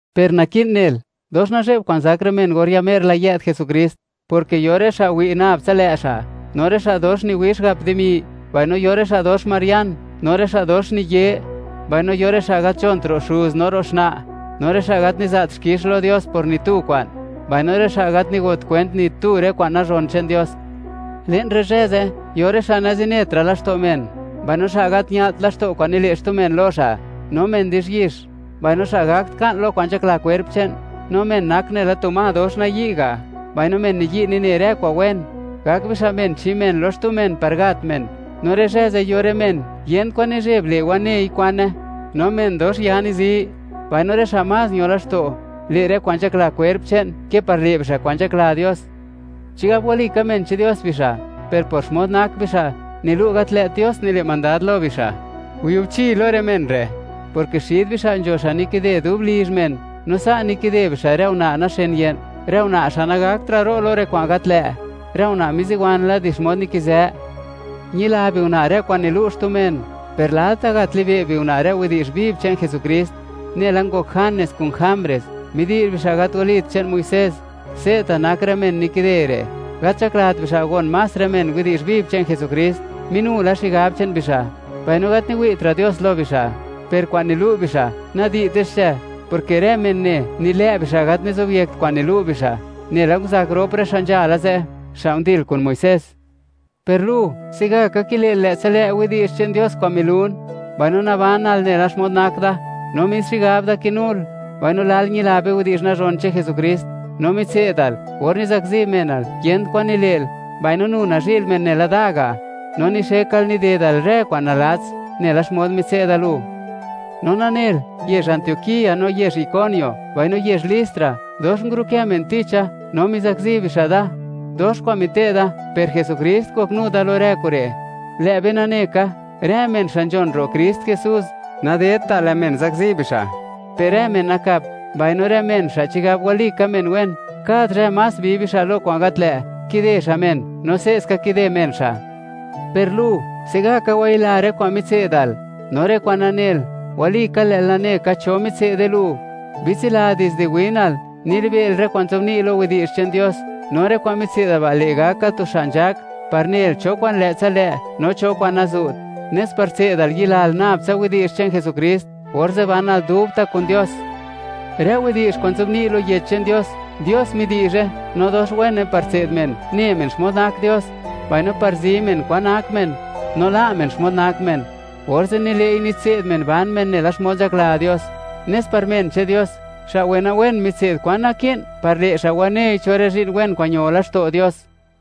Per naki'n nel, dox nazhe'b kwa'n zak rë men or ya mer la yë'd Jesukrist, porke yo rë xa' wi' nab tsa lë' xa', no rë xa' dox niwix gap dimi, mbaino yo rë xa' dox marian, rë xa' dox niye; mbaino yo rë xa' gat nzhont ro' xuz no ro' xna', no rë xa' gat niza't xkix lo Dios por ni tu kwa'n, mbaino rë xa' gat nigot kwent ni tu rë kwa'n nazhon che'n Dios. Le'n rë zhë ze', yo rë xa' nazinetra' laxto' men, mbaino xa' gat ña'lt laxto' kwa'n nile' xtu men lo xa', no men di'zhyix, mbaino xa' gakt ka'n lo kwa'n nzhakla kwerp che'n, no men nak nela tu ma dox nayi' ga', mbaino men niyi' nine rë kwa'n wen. Gak bixa' men chi men lo xtu men par gat men, no rë zhë ze' yo rë men yent kwan nizheb le' wanei kwane, no men dox ya nizi; mbaino rë xa' más ño laxto', le' rë kwa'n nzhakla kwerp che'n ke par le' bixa' kwa'n nzhakla Dios. Chigab walika men che'n Dios bixa', per por xmod nak bixa', nilu' gat lë't Dios nile' mandad lo bixa'. Yubchi lo rë men re', porke xid bixa' nzho xa' nikide dub lizh men, no sa' nikide bixa' rë una' naxen ye'n, rë una' xa' nagaktra' ro' lo rë kwa'n gat lë', rë una' miziwan la di xmod nikizë. Ñila biuna' rë kwa'n nilu' xtu men, per lalta' gat libe' biuna' rë widi'zh viv che'n Jesukrist. Nela ngok Janes kun Jambres, midi'zh bixa' gat walit che'n Muisés, se'ta' nak rë men nikide re'. Gat nzhaklat bixa', gon más rë men widi'zh viv che'n Jesukrist; minu la xigab che'n bixa', mbaino gat niwi'tra' Dios lo bixa'. Per kwa'n nilu' bixa', nadi'te xche, porke rë men ne, nilë' bixa' gat nizobyekt kwa'n nilu' bixa', nela nguzak rop xa' nzhala ze', xa' ndil kun Muisés. Per lu, se'gaka kile'l lë'tsa lë' widi'zh che'n Dios kwa'n nilun, mbaino nabanal nela xmod nak da, no mis xigab da kinul, mbaino lal ñila be widi'zh nazhon che'n Jesukrist; no mitse'dal, or nizakzi menal, yent kwan nile'l, mbaino nu nazhi'l men nela da ga', no nixekal nidedal rë kwa'n nalats nela xmod mitse'da lu. No nanel, yezh Antioquía, no yezh Iconio, mbaino yezh Listra, dox ngurukë men ticha no mizakzi bixa' da. Dox kwa'n mite'da, per Jesukrist ngoknu da lo rë kure'. Lë' be nane ka, rë men xa' nzhon ro' Krist Jesús, nadedta' lë' men zakzi bixa', per rë men nakap, mbaino rë men xa' chigab walika men wen, kad zhë más bi bixa' lo kwa'n gat lë'; kide xa' men, no se'ska kide men xa'. Per lu, se'gaka wayila rë kwa'n mitse'dal, no rë kwa'n nanel, walika, lë'l nane ka cho mitse'de lu. Bitsila, dizde winal, nilibe'l rë kwa'n nzobni' lo Yech che'n Dios, no rë kwa'n mitse'dal ba' le' gakal tu xa' nzhak par nel cho kwa'n lë'tsa lë' no cho kwa'n nazu't, nes par tse'dal yilal nab tsa widi'zh che'n Jesukrist, orze' banal dubta' kun Dios. Rë widi'zh kwa'n nzobni' lo Yech che'n Dios, Dios midi'zhe, no dox wene par tse'd men, ne men xmod nak Dios, mbaino par zi men kwan nak men, no la' men xmod nak men, orze' nile'i nitse'd men ban men nela xmod nzhakla Dios, nes par men che'n Dios, xa' wenawen mitse'd kwan naki'n par le' xa' wanei cho rë zhi'n wen kwa'n ño laxto' Dios.